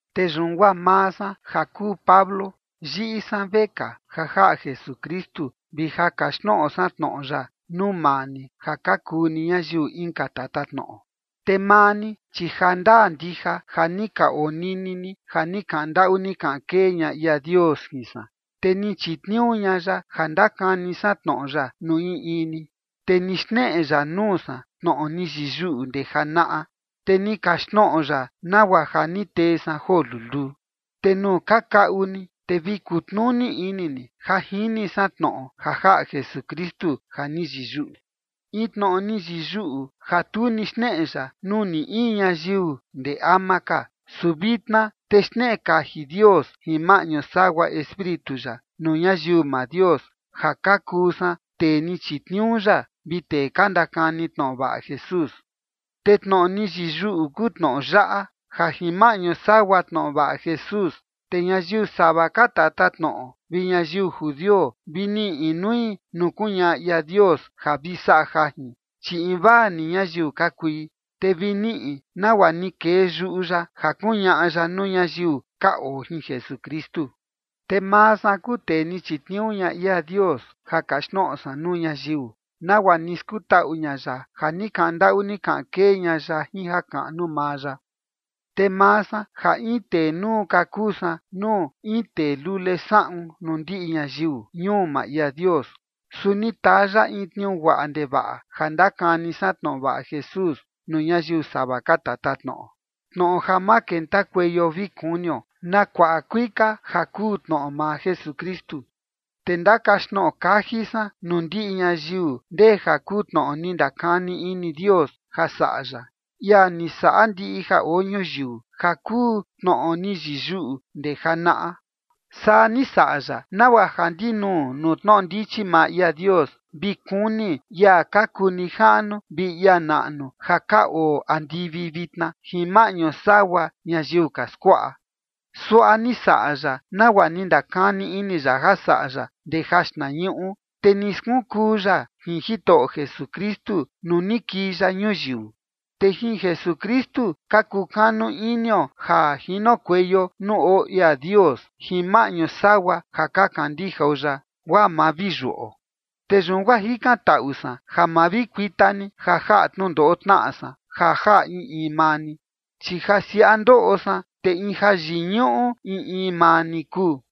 Te yun guaa maa san ja kuu Pablo, yiꞌi san vekaa ja jaꞌa Jesukristu vi ja kaxtnoꞌo san tnoꞌo ya nuu maa ni ja ka kuu ni ñayiu inka tatatnoꞌo. Te maa ni, chi ja ndaa ndija ja ni ka onini ni ja ni kaꞌan ndaꞌu ni kaꞌan kee ña ia Dios jin san, te ni chitniuu ña ya ja ndakani san tnoꞌo ya nuu in in ni. Te ni xneꞌe ya nuu san tnoꞌo ni yiyuꞌu ndee janaꞌa, te ni kaxtnoꞌo ya, nagua ja ni tee san joo luluu. Te nuu ka kaꞌu ni, te vi kutnuni ini ni ja jini san tnoꞌo ja jaꞌa Jesukristu ja ni yiyuꞌu, in tnoꞌo ni yiyuꞌu ja tu ni xneꞌe ya nuu ni in ñayiu ndee ama ka, su vitna te xneꞌe kaji Dios jin maꞌñu sagua Espíritu ya nuu ñayiu maa Dios ja ka kuu san tee ni chitniuu ya vi tee ka ndakani tnoꞌo vaꞌa Jesús. Te tnoꞌo ni yiyuꞌu kuu tnoꞌo yaꞌa: Ja jin maꞌñu sagua tnoꞌo vaꞌa Jesús, te ñayiu sava ka tatatnoꞌo vi ñayiu judio vi niꞌi inui nuu kuñaꞌa ia Dios ja vi saꞌa jajin, chi invaa ni ñayiu ka kui, te vi niꞌi nagua ni kee yuꞌu ya ja kuñaꞌa ya nuu ñayiu ka oo jin Jesukristu. Te maa san kuu tee ni chitniuu ña ia Dios ja kaxtnoꞌo san nuu ñayiu, nagua ni skutaꞌu ña ya ja ni kaꞌan ndaꞌu ni kaꞌan kee ña ya jin jakaꞌnu maa ya. Te maa san ja in tee nuu ka kuu san nuu in tee lule saꞌun nuu ndiꞌi ñayiu ñuu maa ia Dios, su ni taa ya in tniuu guaꞌa ndevaꞌa ja ndakani san tnoꞌo vaꞌa Jesús nuu ñayiu sava ka tatatnoꞌo, tnoꞌo ja ma kentakueio vi kunio na kuaꞌa kuika ja kuu tnoꞌo maa Jesukristu. Te ndakaxtnoꞌo kaji san nuu ndiꞌi ñayiu ndee ja kuu tnoꞌo ni ndakani ini Dios ja saꞌa ya, ia ni saꞌa ndiꞌi ja oo ñuyiu, ja kuu tnoꞌo ni yiyuꞌu ndee janaꞌa. Saa ni saꞌa ya, nagua ja ndinuu nuu tnoꞌo ndichi maa ia Dios vi kuni ia ka kuu nijaꞌnu vi ia naꞌnu ja ka oo andivi vitna, jin maꞌñu sagua ñayiu ka skuaꞌa. Suaꞌa ni saꞌa ya nagua ni ndakani ini ya ja saꞌa ya ndee jaxtnañuꞌu, te ni skunkuu ya jin Jitoꞌo Jesukristu nuu ni kii ya ñuyiu. Te jin Jesukristu ka kukanu inio ja jinokueio nuu oo ia Dios jin maꞌñu sagua ja ka kandijao ya, guaa ma vi yuꞌo. Te yun guaa jikantaꞌu san ja ma vi kuita ni ja jaꞌa tnundoꞌo tnaꞌa san ja jaꞌa in in maa ni, chi ja siaꞌa ndoꞌo san, te in jayiñuꞌu in in maa ni kuu.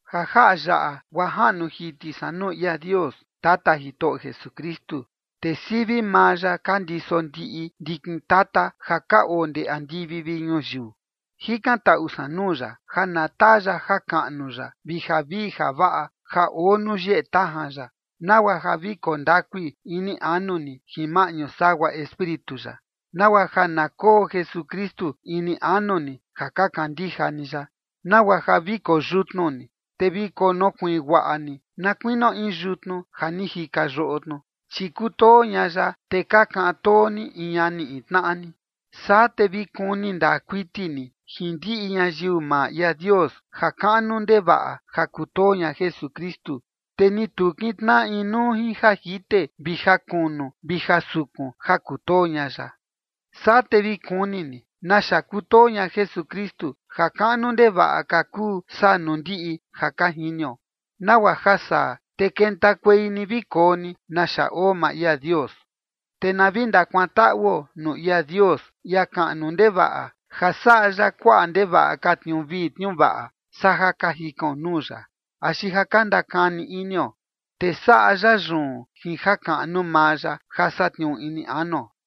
Ja jaꞌa yaꞌa guaa jaꞌnu jiti san nuu ia Dios, Tata Jitoꞌo Jesukristu. Te sivi maa ya ka ndiso ndiꞌi ndikin tata ja ka oo ndee andivi vi ñuyiu. Jikantaꞌu san nuu ya, ja na taa ya jakaꞌnu ya vi javii javaꞌa ja oo nuu yeꞌe tajan ya, nagua ja vi koo ndakui ini anu ni jin maꞌñu sagua Espíritu ya, nagua ja na koo Jesukristu ini anu ni ja ka kandija ni ya, nagua ja vi koyutnu ni, te vi konokuiin guaꞌa ni na kuinio in yutnu ja ni jika yoꞌo tnu, chi kutoo ña ya, te ka kaꞌan too ni in ñani in tnaꞌa ni. Saa te vi kuni ndaa kuiti ni jin ndiꞌi ñayiu maa ia Dios ja kaꞌnu ndevaꞌa ja kutoo ña Jesukristu, te ni tu kintnaꞌa inuu jin ja jite vi ja kunu vi ja sukun ja kutoo ña ya. Saa te vi kuni ni naxa kutoo ña Jesukristu, ja kaꞌnu ndevaꞌa ka kuu saa nuu ndiꞌi ja ka jinio, nagua ja saa, te kentakuei ni vi koo ni naxa oo maa ia Dios. Te na vi ndakuantaꞌuo nuu ia Dios, ia kaꞌnu ndevaꞌa, ja saꞌa ya kuaꞌa ndevaꞌa ka tniuu vii tniuu vaꞌa, saa ja ka jikaon nuu ya, axi ja ka ndakani inio, te saꞌa ya yun jin jakaꞌnu maa ya ja satniuu ini anuo.